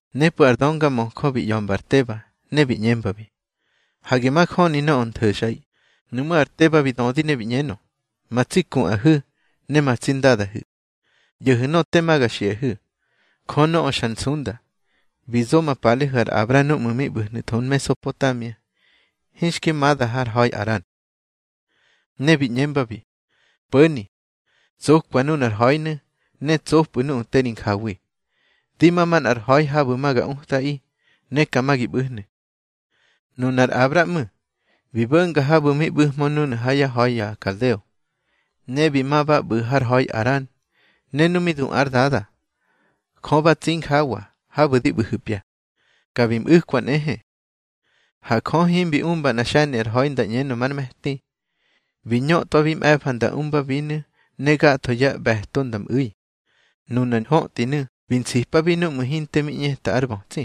Nepꞌu̱ ar döngamöjö bi ꞌya̱mba ar Teba, ne bi ꞌñembabi: —Hage majöni nöꞌö ntho̱xꞌaꞌi. Nuꞌmú̱ ar Teba bi dödi ne bi ꞌñenö: —Ma tsi kuꞌahu̱, ne ma tsi ndadahu̱, ꞌyo̱hu̱ nöꞌö tema ga xiꞌahu̱. Jö nöꞌö xar nsunda, bi zo ma palehu̱ ar Abra núꞌmu̱ mi ꞌbu̱hnu̱tho Mesopotamia, hinxki mada har ha̱i Aran. Ne bi ꞌñembabi: Po̱ni, tsokwa nunar ha̱inu̱, ne tsopꞌu̱ nuꞌu̱ te ri njawi. Di ma manꞌar ha̱i habu̱ ma ga utꞌaꞌi, ne ka ma gi ꞌbu̱hnu̱. Nunar Abra ꞌmu̱, bi bo̱nga habu̱ mi ꞌbu̱hmö núnu̱ ha yá ha̱i ya kaldeo, ne bi ma ba ꞌbu̱ har ha̱i Aran. Ne nu mi du ár dada, Jö ba tsi injawa habu̱ di ꞌbu̱hu̱pya, ka bi mꞌu̱kwa nꞌehe. Ha Jö himbi umba nꞌa xe̱ni ar ha̱i nda ꞌñenö már me̱ti. Bi ñöꞌtwabi mꞌe̱fa nda umbabinu̱ ne gatho yá ꞌbe̱to nda mꞌu̱i. Nunar ñhöꞌtinu̱ bi nsipabi núꞌmu̱ hinte mi ꞌñeta ar bötsi.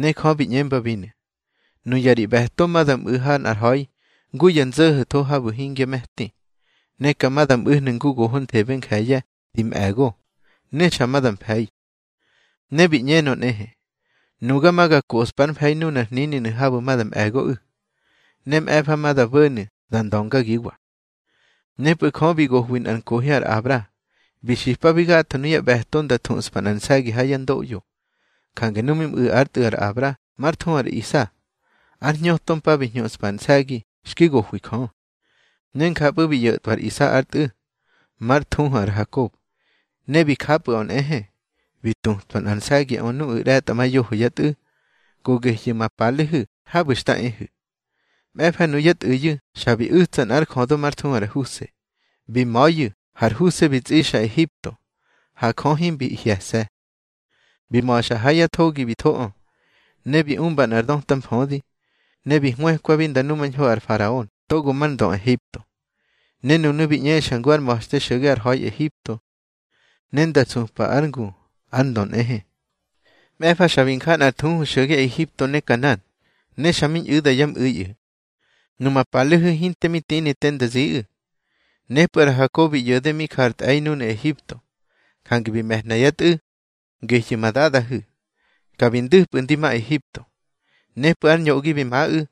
Ne Jö bi ꞌñembabinu̱: Nuya ri ꞌbe̱to ma da mꞌu̱ ha nꞌar ha̱i ngu ya nzo̱ho̱tho habu̱ hingya me̱ti. Ne ka ma da mꞌu̱hnu̱ ngu gohonthebe nje̱ye̱ di mꞌe̱go, ne xa ma da mfe̱i. Ne bi ꞌñenö nꞌehe: Nuga ma ga koꞌspár mfe̱i nunar hnininu̱ habu̱ ma da mꞌe̱goꞌu̱. Ne mꞌe̱fa ma nda bo̱nu̱ nda ndöngagiwa. Nepꞌu̱ Jö bi gohwi nꞌar nkohi ar Abra, bi xipabi gatho nuyá ꞌbe̱to nda thuꞌspa nꞌar nse̱gi ha yá ndoꞌyo. Jange nu mi mꞌu̱ ár tꞌu̱ ar Abra mar thuhu ar Isa, ár hñöto mpa bi hñuꞌspa ar nse̱gi xki gohwi Jö. Ne njapꞌu̱ bi ꞌyo̱tꞌwa ar Isa ár tꞌu̱, már thuhu ar Hakob. Ne bi japꞌu̱ꞌö nꞌehe, bi tutwa nor nse̱giꞌö nuꞌu̱ ꞌre̱tꞌamayoho yá tꞌu̱, go gehyu̱ ma palehu̱ habu̱ xta ehu̱. Mꞌe̱fa nuyá tꞌu̱yu̱ xa bi u̱tsa nꞌár jödö már thuhu ar Huse. Bi ma̱yu̱, har Huse bi tsꞌixa Ehipto. Ha Jö himbi hye̱se̱. Bi ma̱xa ha ya thogi bi thoꞌö. Ne bi umba nꞌar döta mfödi, ne bi hwëkwabi nda numañho ar faraon togo már ndö Ehipto. Ne nunu̱ bi ꞌñexa ngu ár ma̱xte xo̱ge har ha̱i Ehipto, ne nda supa ár ngu ar ndö nꞌehe. Mꞌe̱fa xa bi nja nꞌar thuhu xo̱ge Ehipto ne Kanan, ne xa mi ñꞌu̱da yá mꞌu̱iꞌu̱. Numa palehu̱ hinte mi tini te nda ziꞌu̱. Nepꞌu̱ ar Hakob bi ꞌyo̱de mi ja ar tꞌe̱i núnu̱ Ehipto, jange bi me̱hna yá tꞌu̱, gehyu̱ ma dadahu̱, ka bi ndu̱pꞌu̱ ndi ma Ehipto. Nepꞌu̱ ar ñoꞌgi mi maꞌu̱,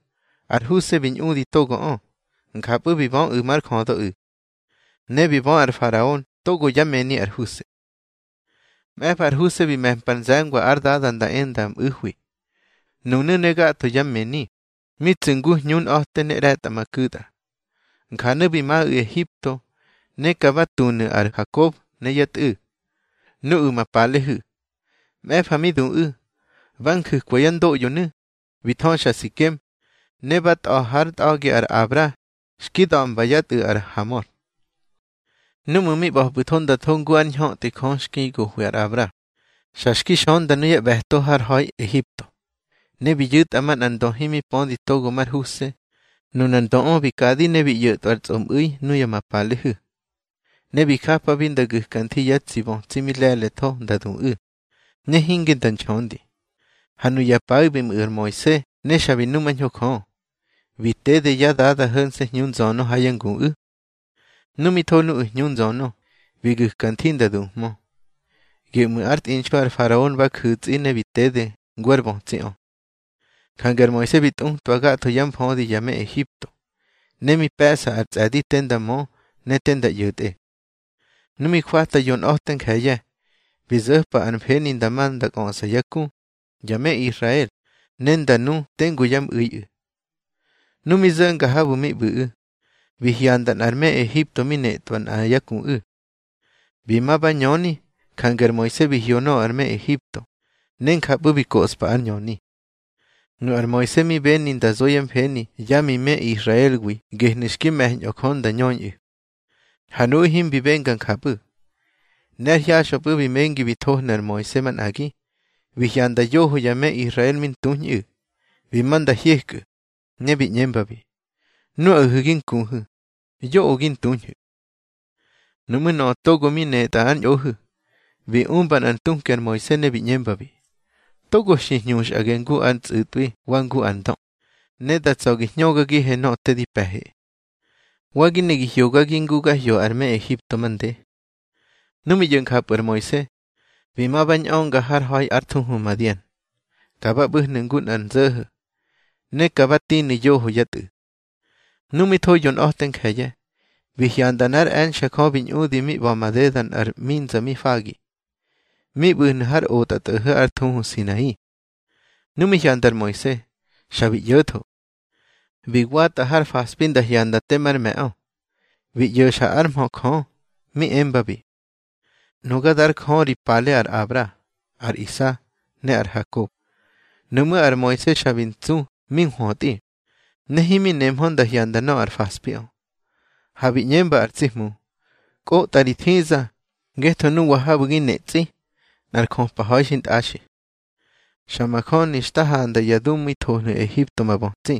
ar Huse bi ñꞌudi togoꞌö, njapꞌu̱ bi böꞌu̱ már jödöꞌu̱. Ne bi bö ar faraon togo yá mëni ar Huse. Mꞌe̱fa ar Huse bi me̱mpar nze̱ngwa ár dada nda e nda mꞌu̱hwi, nunu̱ ne gatho yá mëni, mi tsu̱ ngu hñunꞌa̱te ne ꞌre̱tꞌamaku̱tꞌa. Njanu̱ bi maꞌu̱ Ehipto. Ne ka ba tunu̱ ar Hakob ne yá tꞌu̱, nuꞌu̱ ma palehu̱. Mꞌe̱fa mi duꞌu̱, ba nju̱kwa yá ndoꞌyonu̱, bi thöxa Sikem, ne ba tꞌa̱ hár ntꞌa̱gi ar Abra xki da̱mba yá tꞌu̱ ar Hamor. Núꞌmu̱ mi ꞌba̱pꞌu̱tho nda tho ngu ár ñhöꞌti Jö xki gohwi ar Abra, xa xki xönda nuyá ꞌbe̱to har ha̱i Ehipto. Ne bi yu̱tꞌa manꞌar ndö himi pödi togo mar Huse. Nunar ndöꞌö bi kadi ne bi ꞌyo̱tꞌwar tsꞌomꞌu̱i nuya ma palehu̱. Ne bi japabi nda gu̱ka nthi yá tsi bötsi mi le̱le̱tho nda duꞌu̱, ne hinge nda nxöndi. Ha nuya paꞌu̱ bi mꞌu̱ ar Moise, ne xa bi numañho Jö. Bi tede yá dada ho̱nse̱ hñu nzönö ha yá nguꞌu̱. Nu mi tho nuꞌu̱ hñu nzönö, bi gu̱ka nthi nda duhmö. Geꞌmu̱ ár tꞌinxu ar faraon ba ju̱tsꞌi, ne bi tede ngu ár bötsiꞌö. Jange ar Moise bi tꞌutwa gatho yá mfödi ya me Ehipto, ne mi pe̱ꞌsa ar tsꞌe̱di te nda mö ne te nda ꞌyo̱tꞌe. Nu mi jwata yonꞌa̱te nje̱ye̱, bi zo̱pa ár mfeni nda ma nda kꞌöꞌsa yá ku, ya me Israel, ne nda nu tengu yá mꞌu̱iꞌu̱. Nu mi zo̱nga habu̱ mi ꞌbu̱ꞌu̱, bi hyanda nꞌar me Ehipto mi netꞌwa nꞌa yá kuꞌu̱. Bi ma ba ñöni, jange ar Moise bi hyo nöꞌö ar me Ehipto, ne njapꞌu̱ bi koꞌspa ár ñöni. Nu ar Moise mi beni nda zo yá mfeni yá mi me Israelwi gehnu̱ xki me̱ñꞌö Jö nda ñöñꞌu̱, ha nuꞌu̱ himbi benga njapꞌu̱. Ne ár hyaxꞌöpꞌu̱ bi mengi bi thohnu̱ ar Moise manꞌagi, bi hyanda yoho ya me Israel mi ntuñꞌu̱. Bi ma nda hyekꞌu̱, ne bi ꞌñembabi: Nuꞌahu̱ gi nkuhu̱, yoꞌö gi ntuñhu̱. Nuꞌmú̱ nöꞌö togo mi netꞌa ár ñꞌohu̱, bi umba nꞌar ntuki ar Moise, ne bi ꞌñembabi: Togo xi hñuxꞌage ngu ar tsꞌu̱tꞌwi wa ngu ar ndö, ne da tsa̱ gi hñögagihe nöꞌö te di pe̱he. Wa gi ne gi hyogagi ngu ga hyo ar me Ehipto mande. Nu mi ꞌyo̱ njapꞌu̱ ar Moise, bi ma ba ñꞌönga har ha̱i ár thuhu Madian. Ka ba ꞌbu̱hnu̱ ngu nꞌar nzo̱ho̱, ne ka ba tinu̱ yoho yá tꞌu̱. Nu mi tho yonꞌa̱te nje̱ye̱, bi hyanda nꞌár e̱nxe̱ Jö bi ñꞌudi mi ꞌba̱ madeda nꞌar ꞌminza mi fagi, mi ꞌbu̱hnu̱ har otꞌatꞌo̱ho̱ ár thuhu Sinai. Nu mi hyanda ar Moise, xa bi ꞌyo̱tho. Bi watꞌa har faspi nda hyanda te mar me̱ꞌö, bi ꞌyo̱xa ár mhö Jö, mi embabi: Nuga dár Jö ri pale ar Abra, ar Isa, ne ar Hakob. Nuꞌmú̱ ar Moise xa bi ntsu mi nhwötꞌi, ne himi nemhö nda hyanda nöꞌö ar faspiꞌö. Ha bi ꞌñemba ar tsi Hmu: Kꞌotꞌa ri thiza, ngetho nuwa habu̱ gi netsꞌi, nꞌar jöpa ha̱i xintꞌaxi. Xa majöni xta handa ya dumu̱i thohnu̱ Ehipto ma bötsi.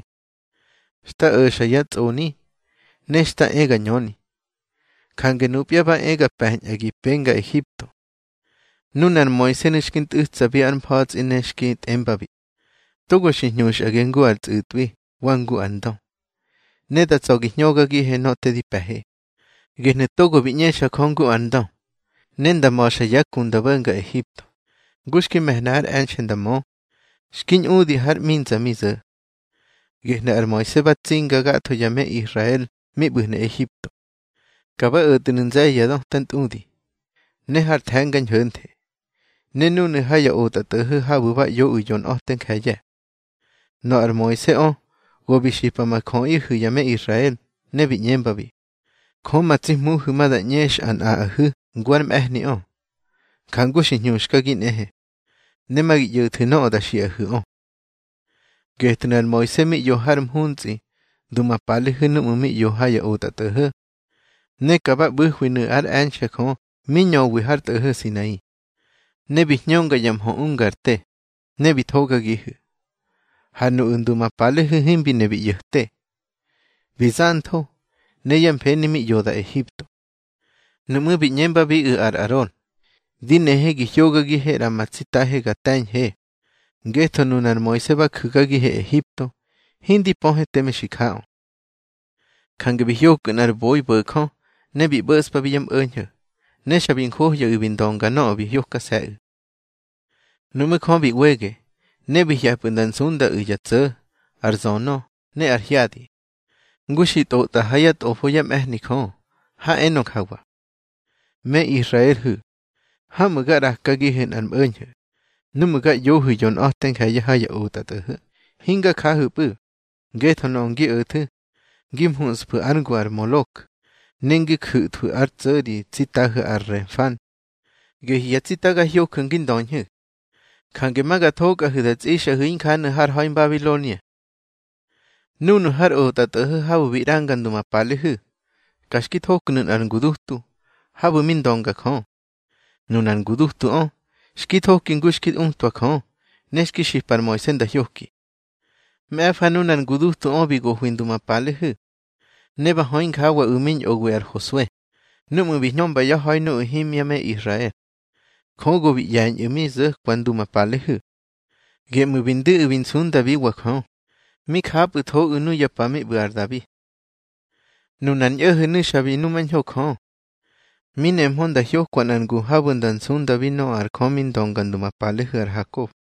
Xta o̱xa yá tsꞌoni, ne xta e ga ñöni. Jange nupya ba e ga pe̱ñꞌa gi penga Ehipto. Nunar Moisenu̱ xki ntꞌu̱tsabi ár mfa̱tsꞌi ne xki tꞌembabi: Togo xi hñuxꞌage ngu ar tsꞌu̱tꞌwi wa ngu ar ndö, ne da tsa̱ gi hñögagihe nöꞌö te di pe̱he. Gehnu̱ togo bi ꞌñexa Jö ngu ar ndö, ne nda ma̱xa yá ku nda bo̱nga Ehipto, ngu xki me̱hna ár e̱nxe̱ nda mö, xki ñꞌudi har ꞌminza mi zo̱. Gehnu̱ ar Moise ba tsinga gatho ya me Israel mi ꞌbu̱hnu̱ Ehipto. Ka ba o̱tnu̱ nze̱ye̱ ya döta ntꞌudi, ne har The̱nga Ñho̱nthe, ne núnu̱ ha ya otꞌatꞌo̱ho̱ habu̱ ba ꞌyoꞌu̱ yonꞌa̱te nje̱ye̱. Nöꞌö ar Moiseꞌö go bi xipa ma jöꞌihu̱ ya me Israel, ne bi ꞌñembabi: Jö ma tsi Hmuhu̱ ma da ꞌñexa nꞌaꞌahu̱ ngu ár mꞌe̱hniꞌö, njangu xi hñuxkagi nꞌehe. Ne ma gi ꞌyo̱thu̱ nöꞌö da xiꞌahu̱ꞌö. Getnu̱ ar Moise mi ꞌyo har mhuntsꞌi ndu ma palehu̱ núꞌmu̱ mi ꞌyo ha ya otꞌatꞌo̱ho̱. Ne ka ba ꞌbu̱hwinu̱ ár e̱nxe̱ Jö mi ñöwi har tꞌo̱ho̱ Sinai. Ne bi hñönga ya mhö ungar te, ne bi thogagihu̱. Ha nuꞌu̱ ndu ma palehu̱ himbi ne bi ꞌyo̱te, bi zantho, ne yá mfeni mi ꞌyoda Ehipto. Nuꞌmú̱ bi ꞌñembabiꞌu̱ ar Aron: Di nehe gi hogagihe ꞌra ma tsitahe ga te̱ñhe. Ngetho nunar Moise ba ju̱gagihe Ehipto, hindi pöhe teme xi jaꞌö. Jange bi hyokꞌu̱ nꞌar boi bo̱jö, ne bi ꞌbo̱ꞌspabi yá mꞌo̱ñho̱. Ne xa bi njohyaꞌu̱ bi ndönga nöꞌö bi hyokase̱ꞌu̱. Nuꞌmú̱ Jö bi ꞌwege, ne bi hye̱pꞌu̱ nda nsundaꞌu̱ ya tso̱, ar zönö, ne ar hyadi, ngu xi tꞌotꞌa ha yá tꞌofo yá mꞌe̱hni Jö, ha enö njawa: Me Israelhu̱, hamꞌu̱ ga ꞌrakagihu̱ nꞌar mꞌo̱ñho̱ núꞌmu̱ ga ꞌyohu̱ yonꞌa̱te nje̱ye̱ ha ya otꞌatꞌo̱ho̱. Hinga jahu̱pꞌu̱, ngetho nöꞌö ngi o̱thu̱ ngi muꞌsfu̱ ár ngu ar Molok, ne ngi ju̱thwu̱ ár tso̱ ri tsitahu̱ ar Renfán. Gehyu̱ ya tsita ga hyoju̱ ngi ndöñhu̱. Jange ma ga thokꞌahu̱ da tsꞌixꞌahu̱ injanu̱ har ha̱i Mbabilonia. Núnu̱ har otꞌatꞌo̱ho̱ habu̱ bi ꞌranga ndu ma palehu̱, ka xki thoknu̱ nꞌar ngudutu, habu̱ mi ndönga Jö. Nunar ngudutuꞌö xki thoki ngu xki utwa Jö, ne xki xipa ar Moise nda hyoki. Mꞌe̱fa nunar ngudutuꞌö bi gohwi ndu ma palehu̱. Ne ba hö injawaꞌu̱ mi ñꞌowi ar Hosue, núꞌmu̱ bi hñömba yá ha̱i nuꞌu̱ himya me Israel. Jö go bi ꞌye̱ñꞌu̱ mi zo̱kwa ndu ma palehu̱. Geꞌmu̱ bi ndu̱ꞌu̱ bi nsundabiwa Jö. Mi japꞌu̱thoꞌu̱ nuya pa mi ꞌbu̱ ar Dabi. Nunar ñꞌo̱ho̱nu̱ xa bi numañho Jö. Mi nemhö nda hyokwa nꞌar ngu habu̱ nda nsundabi nöꞌö ar Jö mi ndönga ndu ma palehu̱ ar Hakob.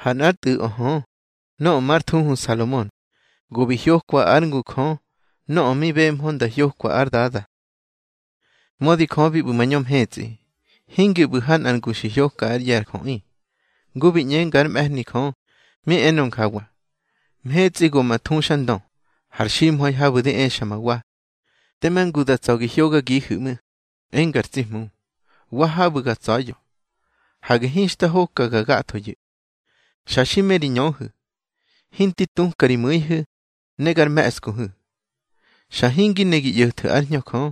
Ha nꞌár tꞌu̱ꞌö hö, nöꞌö már thuhu Salomon, go bi hyokwa ár ngu Jö nöꞌö mi bemhö nda hyoka ár dada. Mödi Jö bi ꞌbu̱ mañö mhetsꞌi, hingi ꞌbu̱ ha nꞌar ngu xi hyoka ár ꞌye̱ ar jöꞌi, ngu bi ꞌñenga ár mꞌe̱hni Jö, mi enö njawa: Mhetsꞌi go ma thuxandö, har ximha̱i habu̱ di exa ma wa. Tema ngu da tsa̱ gi hyogagihu̱ ꞌmu̱, enga ar tsi Hmu. Wa habu̱ ga tsa̱ya̱. Hage hinxta hokaga gathoyu̱. Xa xi me ri ñöhu̱, hinti tuka ri mu̱ihu̱, ne gar me̱ꞌskuhu̱. Xa hingi ne gi ꞌyo̱thu̱ ár Hñö Jö,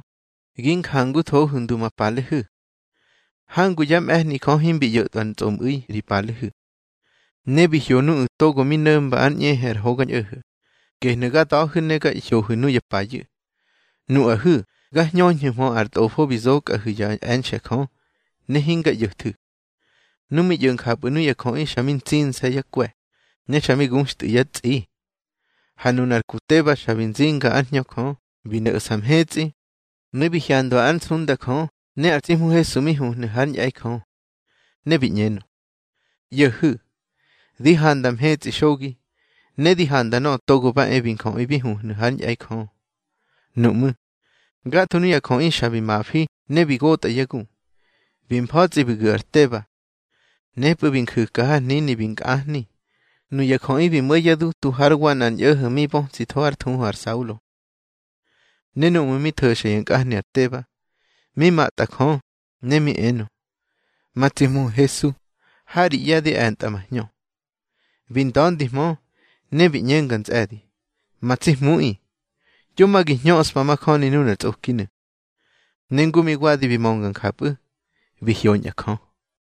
gi njanguthohu̱ ndu ma palehu̱. Hangu yá mꞌe̱hni Jö himbi ꞌyo̱tꞌwa ar tsꞌomꞌu̱i ri palehu̱. Ne bi hyo nuꞌu̱ togo mi no̱mba ár ꞌñehe ar Hogañꞌo̱ho̱, gehnu̱ ga da̱hu̱ ne ga hyohu̱ nuya payu̱. Nuꞌahu̱ ga hñöñhu̱hmö ar tꞌofo bi zokꞌahu̱ yá e̱nxe̱ Jö, ne hinga ꞌyo̱thu̱. Nu mi ꞌyo̱ njapꞌu̱ nuya jöꞌi xa mi ntsinse̱ yá kwe̱, ne xa mi guxtꞌu̱ yá tsꞌi. Ha nunar ku Teba xa bi nzinga ár Hñö Jö, bi no̱ꞌsa mhetsꞌi, ne bi hyandwa ár nsunda Jö ne ar tsi Hmu Hesu mi huhnu̱ hár ñꞌe̱i Jö. Ne bi ꞌñenö: —ꞌYo̱hu̱. Di handa mhetsꞌi xogi, ne di handa Nöꞌö Togo ba e bi Njöꞌi bi huhnu̱ hár ñꞌe̱i Jö. Nuꞌmú̱, gatho nuꞌu̱ ya jöꞌi xa bi mafi ne bi gotꞌa yá gu, bi mfa̱tsꞌi bi gu̱ ar Teba. Nepꞌu̱ bi nju̱ka har hnini bi nkꞌahni. Nuya jöꞌi bi mo̱ yá dutu hár wa nꞌar ñꞌo̱ho̱ mi bötsitho ár thuhu ar Saulo. Ne núꞌmu̱ mi tho̱xa ya nkꞌahni ar Teba, mi matꞌa Jö, ne mi enö: —Ma tsi Hmu Hesu, ha ri ꞌye̱ di e̱ntꞌa ma hñö. Bi nda̱ndihmö, ne bi ꞌñenga ntsꞌe̱di: —Ma tsi Hmuꞌi, yo ma gi hñöꞌspa majöni nunar tsꞌokinu̱. Ne ngu mi wadi bi mönga njapꞌu̱, bi hyoñꞌa Jö.